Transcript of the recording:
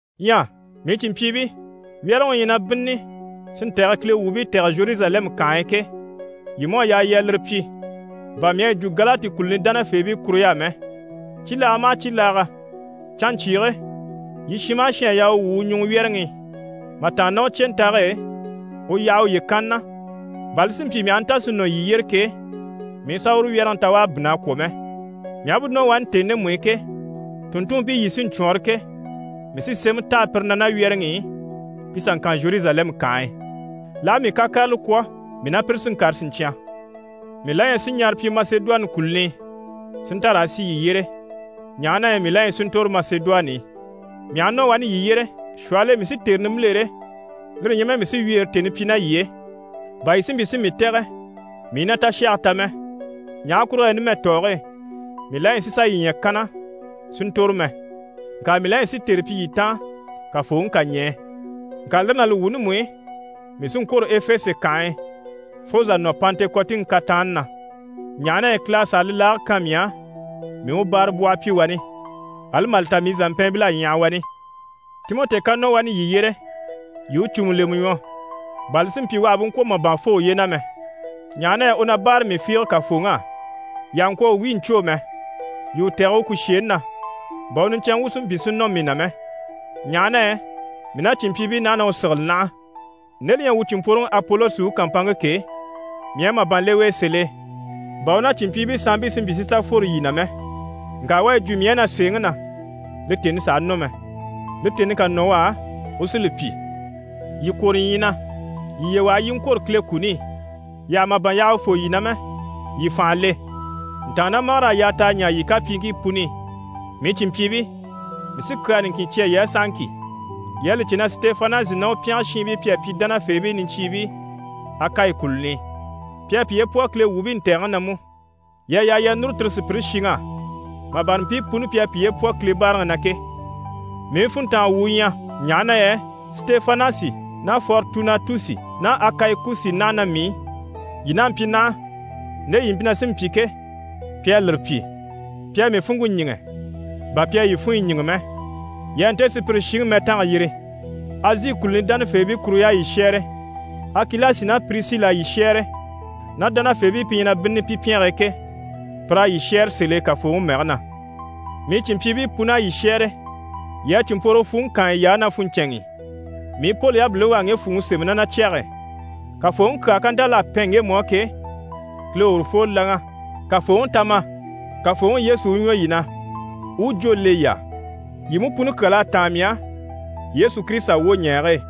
Ɲyɛ mii cìnmpyiibii, wyɛ́rɛŋi u ɲyɛ na bínnini si ntɛ̀gɛ Kile wuubii tɛ̀gɛ Zheruzalɛmu kànhe e ke, yii mú à yaa yii a lire pyi bà mii à yi jwo Galati kùluni dánafeebii kuruɲy'á mɛ. Cibilaaga maha cibilaaga, canɲcyiige yii shin maha shin à yaa u wwû u ɲùŋɔ wyɛ́rɛŋi i, mà tàanna ná u cyentage e, u yaha uye kanni na, bà li si mpyi mii aha nta si nɔ yii yyére ke, mii i sà uru wyɛ́rɛŋi ta u à bínn'a kwɔ̀ mɛ. Mii aha bú nɔ wani tèni ndemu i ke, tùnntunmpii yii sí n‑cwɔɔnrɔ ke, mii sí sémɛ taha pire na ná wyɛ́rɛŋi i pi sà ŋkan Zheruzalɛmu kànhe e. L'aha mii kakarala kwɔ̀, mii ná pire sí n‑kàre siɲcyan. Mii la ɲyɛ si ɲara pyi Masedoni kùluni i, si nta raa sì yii yyére, ɲaha na yɛ mii la ɲyɛ si ntòro Masedoni i. Mii aha nɔ wani yii yyére, shwɔhɔl'e mii sí tère nimbilere, lire ɲyɛ mɛ mii sí wyeere tèni pyi ná yii e, bà yii si mpyi si mii tɛ̀gɛ mii i na tashage ta mɛ. Ɲaha kurugo yɛ numɛ tɔɔge e, mii la ɲyɛ sì sà yii ɲya kanna si ntòro mɛ, ŋka mii la ɲyɛ si tère pyi yii taan, Kafooŋi ká ɲɛɛ. Ŋka lire ná li wuuni mú i, mii sí n‑kwôro Efese kànhe e, fo zà nɔ Pantekɔtiŋi kataanni na, ɲaha na yɛ Kile à sàa li laage kan mii á, mii u báarabwɔhɔ pyi wani, ali mà li ta mii zàmpɛɛnbil'à ɲyaha wani. Timɔti ká nɔ wani yii yyére, yii i u cùmu lemɛ ɲwɔ, bà li si mpyi u àha bú ŋkwɔ̀ màban fô uye na mɛ, ɲaha na yɛ u na báare mii fiige Kafooŋi á. Yii àha ŋkwɔ̀ u wíi ɲcwô mɛ! Yii u tɛ̀gɛ u kùsheeni na bà u niɲcɛnŋɛ wu si mpyi si nɔ mii na mɛ, ɲaha na yɛ mii ná cìnmpyiibii naha na u sigili naha. Nde li ɲyɛ wuu cìnmpworoŋi Apolosi u kàmpanŋke ke, mii à màban le u e sèl'e, bà u ná cìnmpyiibii sanmpii si mpyi si sà fworo yii na mɛ. Ŋka u à yi jwo mii á na sèeŋi na, li tèni sàha nɔ mɛ. Li tèni ká nɔ u á, u sí li pyi. Yii kwôro ɲyii na, yii yiye waha yii i ŋkwôro Kile kuni i, yii àha màban yaha u fô yii na mɛ, yii fànha le. Ntàannamagar'à yaa t'a ɲaa yii kapyiiŋkii puni i. Mii cìnmpyiibii, mii sí kyaa niŋkin cya yii á sahaŋki. Yii à li cè na Sitefanasi ná u pyɛngɛ shiinbii pi à pyi dánafeebii niɲcyiibii Akayi kùluni i, pi à piye pwɔ Kile wuubii ntɛ̀gɛŋi na mú. Yii à yaa yii a núru tire sùpyire shiŋ'á, mà bâra mpii puni pi à piye pwɔ Kile báaraŋi na ke. Mii funntanga wu u ɲyɛ, ɲaha na yɛ Sitefanasi ná Foritunatusi ná Akayikusi naha ná mii i. Yii n'a mpyi naha, nde yii mpyi na sí n‑pyi ke, pi à lire pyi. Pi à mii funŋke ɲíŋɛ, bà pi à yii funɲyi ɲíŋɛ mɛ. Yii a nte sùpyire shiŋi mɛtanga yiri. Azi kùluni dánafeebii kuruɲy'à yii shɛ́ɛre. Akilasi ná Pirisili à yii shɛ́ɛre ná dánafeebii pi ɲyɛ na bínnini pi pyɛnge e ke, pir'à yii shɛ́ɛre sèl'e Kafooŋi mɛge na. Mii cìnmpyiibii pun'à yii shɛ́ɛre. Yii a cìnmpworogo fwùŋi kaan yiy'á ná funɲcɛnŋi i. Mii Poli yabiliŋi u à ŋge fwùŋi sémɛ ná na cyɛge e. Kafooŋi kyaa ká nta l'à pɛn ŋgemu á ke, Kile u urufoo láŋa. «Kafooŋi, ta ma!» Kafooŋi Yesu u ɲwɔ yii na, u u jwó le yii á! Yii mú puni kyal'à táan mii á, Yesu Kirisita wwoɲɛɛge e.